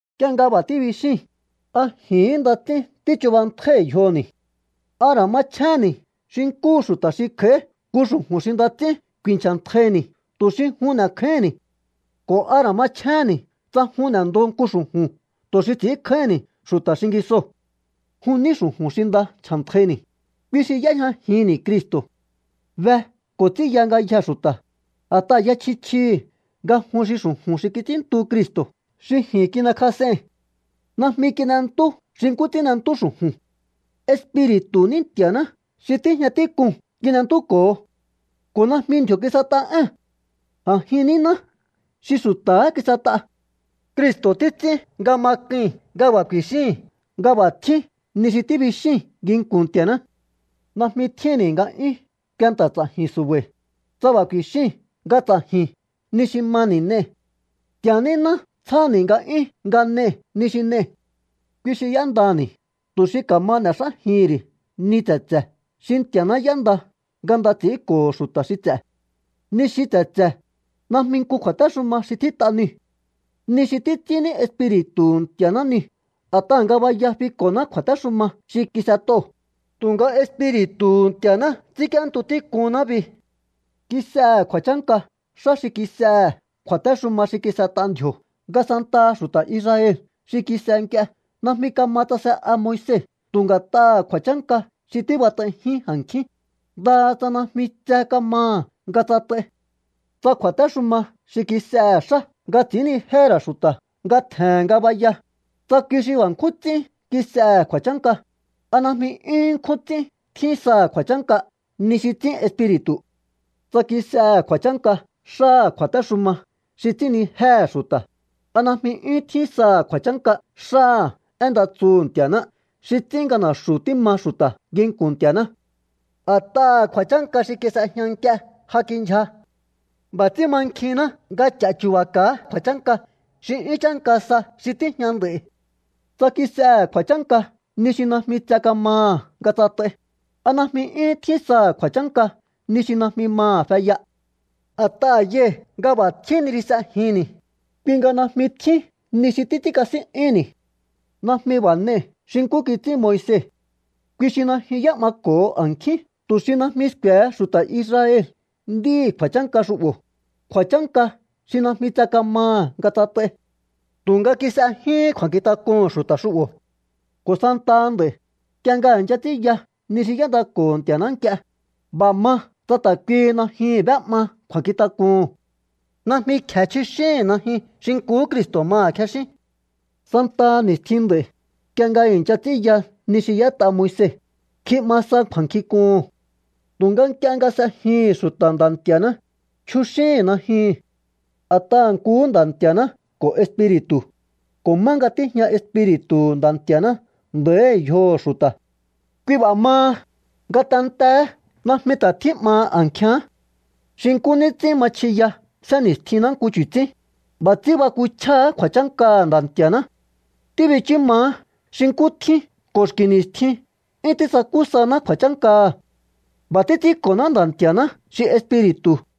Nk'ie nga b'a̱ tíbixíi̱n, ¿a ji̱hín nda ts'ín tíchubantjái̱ yjoni̱? ¿A ra̱ machjéhénni̱ xi nkúhu xu̱ta̱ xi kj'a̱í nku xu̱ju̱n xi nda ts'ín ku̱i̱nchja̱ntjaini̱ tu̱ xi jun n'e̱kjáíhi̱nni̱? ¿Ko̱ a ra̱ machjéhénni̱ tsa jun n'e̱ndo nku xu̱ju̱n tu̱ xi ts'i̱ínkjáíhi̱nni̱ xu̱ta̱ xingisoo̱? Jun ní xu̱ju̱n xi nda ncha̱ntjaini̱, kui xi y'éjñajinni̱ Cristo̱. Be ko̱ ts'ínya ngayjee̱ xu̱ta̱, a̱t'aha̱ ya chji chjihi̱ nga jun xi xu̱ju̱n xi kits'ínntu Cristo̱ xi ji̱n kin'ekjas'ei̱n. Najmi kin'entú xi nkú ts'ín n'entú xu̱ju̱n. Espiri̱tu̱hu̱ ní Nti̱a̱ná xi tíjña tík'uu̱n kin'entúko̱ho. Ko̱ najmi ndji̱o̱ kis'et'a ée̱n. A̱jin níná xi xu̱ta̱há kis'et'a. Cristo̱ títs'ín nga ma k'ui̱n nga b'a̱ ku̱i̱xíi̱n nga b'a̱ tjín ni xi tíbixíi̱n nginku̱n Nti̱a̱ná. Najmi tjínni̱ nga'yún kuenta̱ ts'a̱ji̱n su̱ba̱i̱, tsa b'a̱ ku̱i̱xíi̱n nga ts'a̱ji̱n ni xi mani̱ n'ei̱. Nti̱a̱ níná tsjáni̱ nga'yún nga n'e̱i̱ ni xi n'ei̱. Kui xi y'éndani̱ tu̱ xi ka̱ma n'e̱xájihi̱n ri̱ ni tse̱tse̱ xi Nti̱a̱ná y'énda nga nda ts'i̱ínko̱ho̱ xu̱ta̱ xi ts'e̱. Ni xi tse̱tse̱, najmi nku kju̱a̱téxuma xi tjít'a niu̱. Ni xi títs'ín ní Espiri̱tu̱hu̱ Nti̱a̱ná niu̱. A̱t'aha̱ ngabaya fiko̱ná kju̱a̱téxuma xi kis'et'oo̱, tu̱nga Espiri̱tu̱hu̱ Nti̱a̱ná ts'ínk'íéntu tík'unná bi. Kis'ehe̱ kju̱a̱chánka xá xi kis'ehe̱ kju̱a̱téxuma xi kis'et'a ndji̱o̱ nga santaha xu̱ta̱ Israel xi kis'e nk'ie najmi kama tsase'a Moise tu̱ nga̱t'aha̱ ku̱a̱chánka xi tíbat'aijín a̱nkjín, ndaha tsa najmi tse kamaha̱ nga tsat'ai. Tsa kju̱a̱téxuma xi kis'ehe̱ xá nga ts'i̱ínnijéhe̱ ra̱ xu̱ta̱ nga tje̱he̱n ngabaya, tsa kui xi b'a̱ nkjún ts'ín kis'ehe̱ kju̱a̱chánka, ¿a najmi 'yúhún nkjún ts'ín tjín saha̱ kju̱a̱chánka ni xi ts'ín Espiri̱tu̱? Tsa kis'ehe̱ kju̱a̱chánka xáha̱ kju̱a̱téxuma xi ts'ínnijéhe̱ xu̱ta̱, ¿a najmi 'yúhún tjín saha̱ kju̱a̱chánka xáha̱ én nda tsuhu̱ Nti̱a̱ná xi ts'ín nga na̱xu̱ tíma xu̱ta̱ nginku̱n Nti̱a̱ná? A̱t'aha̱ kju̱a̱chánka xi kis'ejña nk'ie ja kindyja. B'a̱ ts'ín mankjinná nga ch'achu̱ba̱ka̱á kju̱a̱chánka xi 'yún chánka sa xi tíjña nd'a̱i̱. Tsa kis'ehe̱ kju̱a̱chánka ni xi najmi tse kamaha̱ nga tsat'ai, ¿a najmi 'yúhún tjín saha̱ kju̱a̱chánka ni xi najmi maha̱ feya? A̱t'aha̱ yai̱ nga b'a̱ tjín ni xi s'ejinni̱, kui nga najmi tjín ni xi títs'ínkasín'yúhu̱nni̱. Najmi b'a̱ n'ei̱ xi nkú kits'ín Moise. Kui xi najyun y'é'mako̱ho a̱nkjín tu̱ xi najmi sku̱e̱he xu̱ta̱ Israel nd'íhi̱ kju̱a̱chánka xu'bo̱, kju̱a̱chánka xi najmi tse kamaha̱ nga tsat'ai. Tu̱nga kis'e jyuhún kju̱a̱nkjintak'uhu̱n xu̱ta̱ xu'bo̱. Ko̱ santaha nd'a̱i̱, nk'ie nga i̱ncha ts'ínya ni xi y'éndako̱ho̱ Nti̱a̱ná nk'ie, b'a̱ ma tsa ta̱ kuihi najyuu̱n b'é'ma kju̱a̱nkjintak'uhu̱n. Najmi kje̱ chjuxíhi̱n najyun xi nkuhú Cristo̱ maha̱ kjexín. Santaha ni̱stjin nd'a̱i̱, nk'ie nga i̱ncha ts'ínya ni xi y'ét'a Moise, kji'ma sa kju̱a̱nkjink'uhu̱n. Tu̱nga nk'ie nga s'ejihi̱n xu̱ta̱ Nda̱ Nti̱a̱ná, chjuxíhi̱n najyuu̱n. A̱t'aha̱ nkuhú Nda̱ Nti̱a̱ná ko̱ Espiri̱tu̱, ko̱ má nga tíjña Espiri̱tu̱hu̱ Nda̱ Nti̱a̱ná nda̱íhi̱ yjoho̱ xu̱ta̱. Kui b'a̱ maha, ngatenteé najmi ta̱ tjí'maha a̱nkjíán. Xi nkú ní ts'ín ma chjiya sénni̱stjinná nku chu̱tsín, b'a̱ ts'ín bakuchjáá kju̱a̱chánkaha̱ Nda̱ Nti̱a̱ná. Tíbichú maá xi nkú tjín ko̱ xki̱ ni̱stjin 'yún tísakú saná kju̱a̱chánkaha̱. B'a̱ títs'ínko̱ná Nda̱ Nti̱a̱ná xi Espiri̱tu̱.